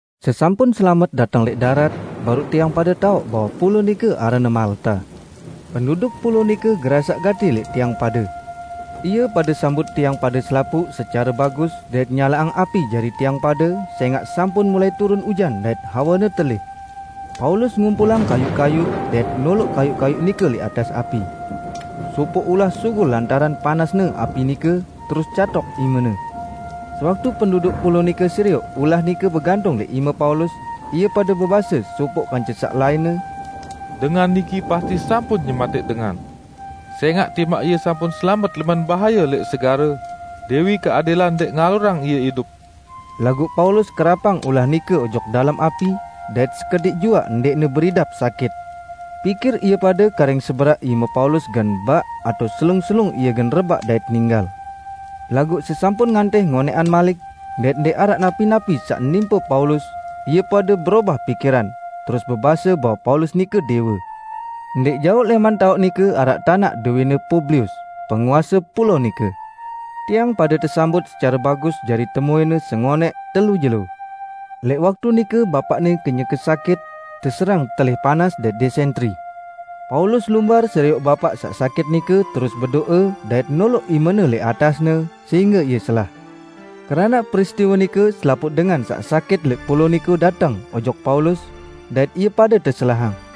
Sesampun selamet dateng lẽq darat, baruq tiang pade taoq bahwe pulao nike aranne Malta. Penduduk pulao nike gerasaq gati lẽq tiang pade. Ie pade sambut tiang pade selapuq secare bagus dait nyalaqang api jari tiang pade sẽngaq sampun mulai turun ujan dait hawene telih. Paulus ngumpulang kayuq-kayuq, dait noloq kayuq-kayuq nike lẽq atas api. Sopoq ulah sugul lantaran panasne api nike, terus catok imene. Sewaktu penduduk pulao nike serioq ulah nike begantung lẽq ime Paulus, ie pade bebase sopoq kance saq lainne, "Dengan niki pasti sampun nyematẽq dengan, sẽngaq timaq ie sampun selamet lẽman bahaye lẽq segare, Dẽwi Keadilan ndẽq ngalurang ie idup." Laguq Paulus kerapang ulah nike ojok dalem api, dait sekediq juaq ndẽqne beridap sakit. Pikir ie pade karing seberaq ime Paulus gen baq atao selung-selung ie gen rebaq dait ninggal. Laguq sesampun ngantih ngonẽqan malik, dait ndẽq araq napi-napi saq nimpe Paulus, ie pade berobah pikiran, terus bebase bahwe Paulus nike dẽwe. Ndẽq jaoq lẽman taoq nike araq tanaq dowẽne Publius, penguase pulao nike. Tiang pade tesambut secare bagus jari temuẽne sengonẽq telu jelo. Lẽq waktu nike bapaqne kenyeke sakit, teserang telih panas dait dẽsentri. Paulus lumbar serioq bapaq saq sakit nike terus bedo'e dait noloq imene lẽq atasne, sehingge ie selah. Keranaq peristiwe nike selapuq dengan saq sakit lẽq pulao nike dateng ojok Paulus, dait ie pade teselahang.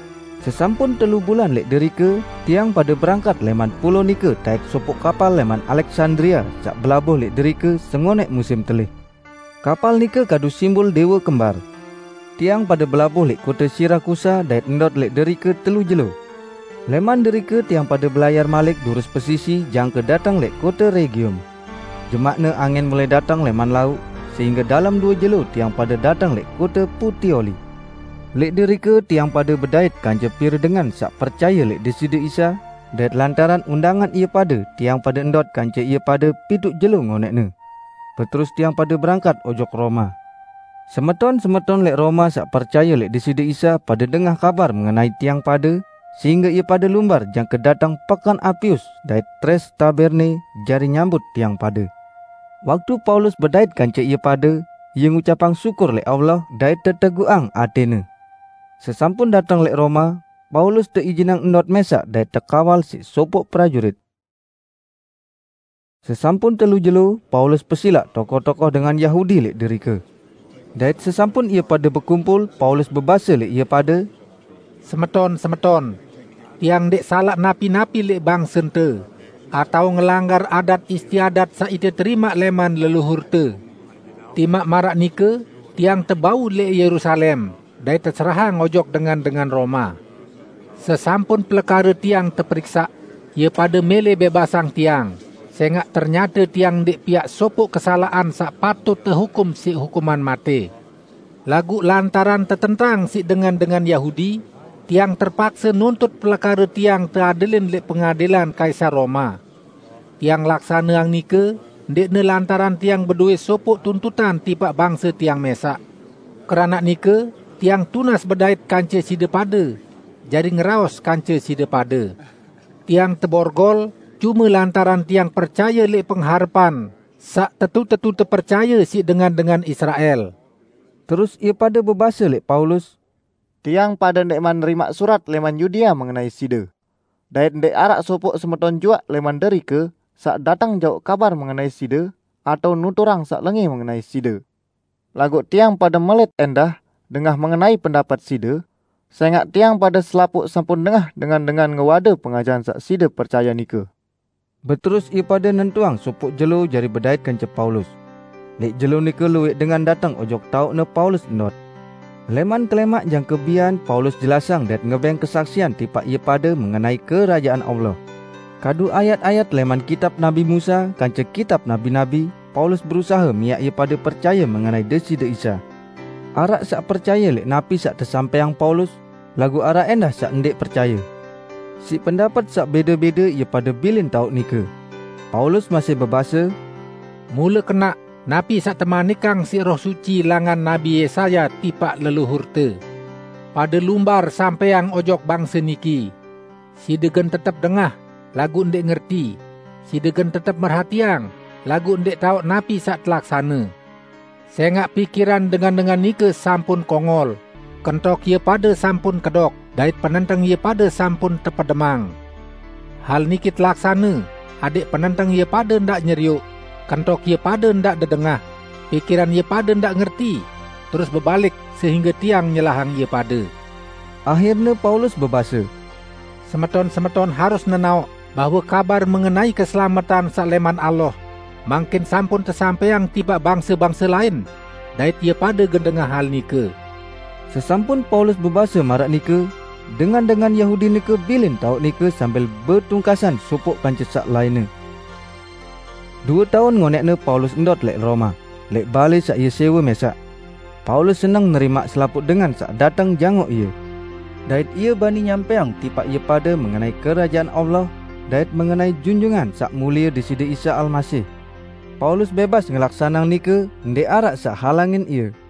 Sesampun telu bulan lẽq derike, tiang pade berangkat lẽman pulao nike taẽk sopoq kapal lẽman Aleksandria saq belabuh lẽq derike sengonẽq musim telih. Kapal nike kadu simbul "Dẽwe Kembar". Tiang pade belabuh lẽq kote Sirakusa dait ndot lẽq derike telu jelo. Lẽman derike tiang pade belayar malik durus pesisi jangke dateng lẽq kote Regium. Jemaqne angin mulai dateng lẽman lauq, sehingge dalem due jelo tiang pade dateng lẽq kote Putioli. Lẽq derike tiang pade bedait kance pire dengan saq percaye lẽq Deside Isa, dait lantaran undangan ie pade tiang pade ndot kance ie pade pituq jelo ngonẽqne. Beterus tiang pade berangkat ojok Roma. Semeton-semeton lẽq Roma saq percaye lẽq Deside Isa pade dengah kabar mengenai tiang pade, sehingge ie pade lumbar jangke dateng Peken Apius dait Tres Taberne jari nyambut tiang pade. Waktu Paulus bedait kance ie pade, ie ngucapang syukur lẽq Allah dait teteguqang atẽne. Sesampun dateng lẽq Roma, Paulus teijinang ndot mẽsaq dait tekawal siq sopoq prajurit. Sesampun telu jelo, Paulus pesilaq tokoh-tokoh dengan Yahudi lẽq derike. Dait sesampun ie pade bekumpul, Paulus bebase lẽq ie pade, "Semeton-semeton! Tiang ndẽq salaq napi-napi lẽq bangsente, atao ngelanggar adat istiadat saq ite terimaq lẽman leluhurte. Timaq maraq nike tiang tebau lẽq Yerusalem dait teserahang ojok dengan-dengan Roma. Sesampun pelekare tiang teperiksaq, ie pade mẽlẽ bẽbasang tiang, sẽngaq ternyate tiang ndẽq piaq sopoq kesalaqan saq patut tehukum siq hukuman matẽ. Laguq lantaran tetentang siq dengan-dengan Yahudi, tiang terpakse nuntut pelekare tiang teadilin lẽq pengadilan Kaisar Roma. Tiang laksaneang nike ndẽqne lantaran tiang bedowẽ sopoq tuntutan tipaq bangse tiang mẽsaq. Keranaq nike tiang tunas bedait kance side pade, jari ngeraos kance side pade. Tiang teborgol cume lantaran tiang percaye lẽq pengharepan saq tetu-tetu tepercaye siq dengan-dengan Israel." Terus ie pade bebase lẽq Paulus, "Tiang pade ndẽqman nerimaq surat lẽman Yudea mengenai side. Dait ndẽq araq sopoq semeton juaq lẽman derike saq dateng jauq kabar mengenai side atao nuturang saq lengẽ mengenai side. Laguq tiang pade melẽt ẽndah dengah mengenai pendapet side, sẽngaq tiang pade selapuq sampun dengah dengan-dengan ngewade pengajahan saq side percaye nike." Beterus ie pade nentuang sopoq jelo jari bedait kance Paulus. Lẽq jelo nike luwẽq dengan dateng ojok taoqne Paulus ndot. Lẽman kelẽmaq jangke bian Paulus jelasang dait ngebẽng kesaksian tipaq ie pade mengenai Kerajaan Allah. Kadu ayat-ayat lẽman Kitab Nabi Musa kance Kitab Nabi-nabi, Paulus berusahe miaq ie pade percaye mengenai Deside Isa. Araq saq percaye lẽq napi saq tesampẽang Paulus, laguq araq ẽndah saq ndẽq percaye. Siq pendapet saq bẽde-bẽde ie pade bilin taoq nike. Paulus masih bebase, "Mule kenaq napi saq temanikang siq Roh Suci langan Nabi Yesaya tipaq leluhurte: 'Pade lumbar sampẽang ojok bangse niki: Side gen tetep dengah, laguq ndẽq ngerti; side gen tetep merhatiang laguq ndẽq taoq napi saq telaksane. Sẽngaq pikiran dengan-dengan nike sampun kongol, kentok ie pade sampun kedok dait penenteng ie pade sampun tepedemang. Hal niki telaksane adẽq penenteng ie pade ndaq nyerioq, kentok ie pade ndaq dedengah, pikiran ie pade ndaq ngerti, terus bebalik, sehingge Tiang, nyelahang ie pade.' " Ahirne Paulus bebase, "Semeton-semeton harus nenaoq bahwe kabar mengenai keselametan saq lẽman Allah mangkin sampun tesampẽang tipaq bangse-bangse lain dait ie pade gen dengah hal nike!" [ Sesampun Paulus bebase maraq nike, dengan-dengan Yahudi nike bilin taoq nike sambil betungkasan sopoq kance saq lainne.] Due taun ngonẽqne Paulus ndot lẽq Roma, lẽq balẽ saq ie sẽwe mẽsaq. Paulus seneng nerimaq selapuq dengan saq dateng jangoq ie. Dait bani ie nyampẽang tipaq ie pade mengenai Kerajaan Allah, dait mengenai Junjungan Saq Mulie Deside Isa Almasih. Paulus bẽbas ngelaksaneang nike ndẽq araq saq halangin ie.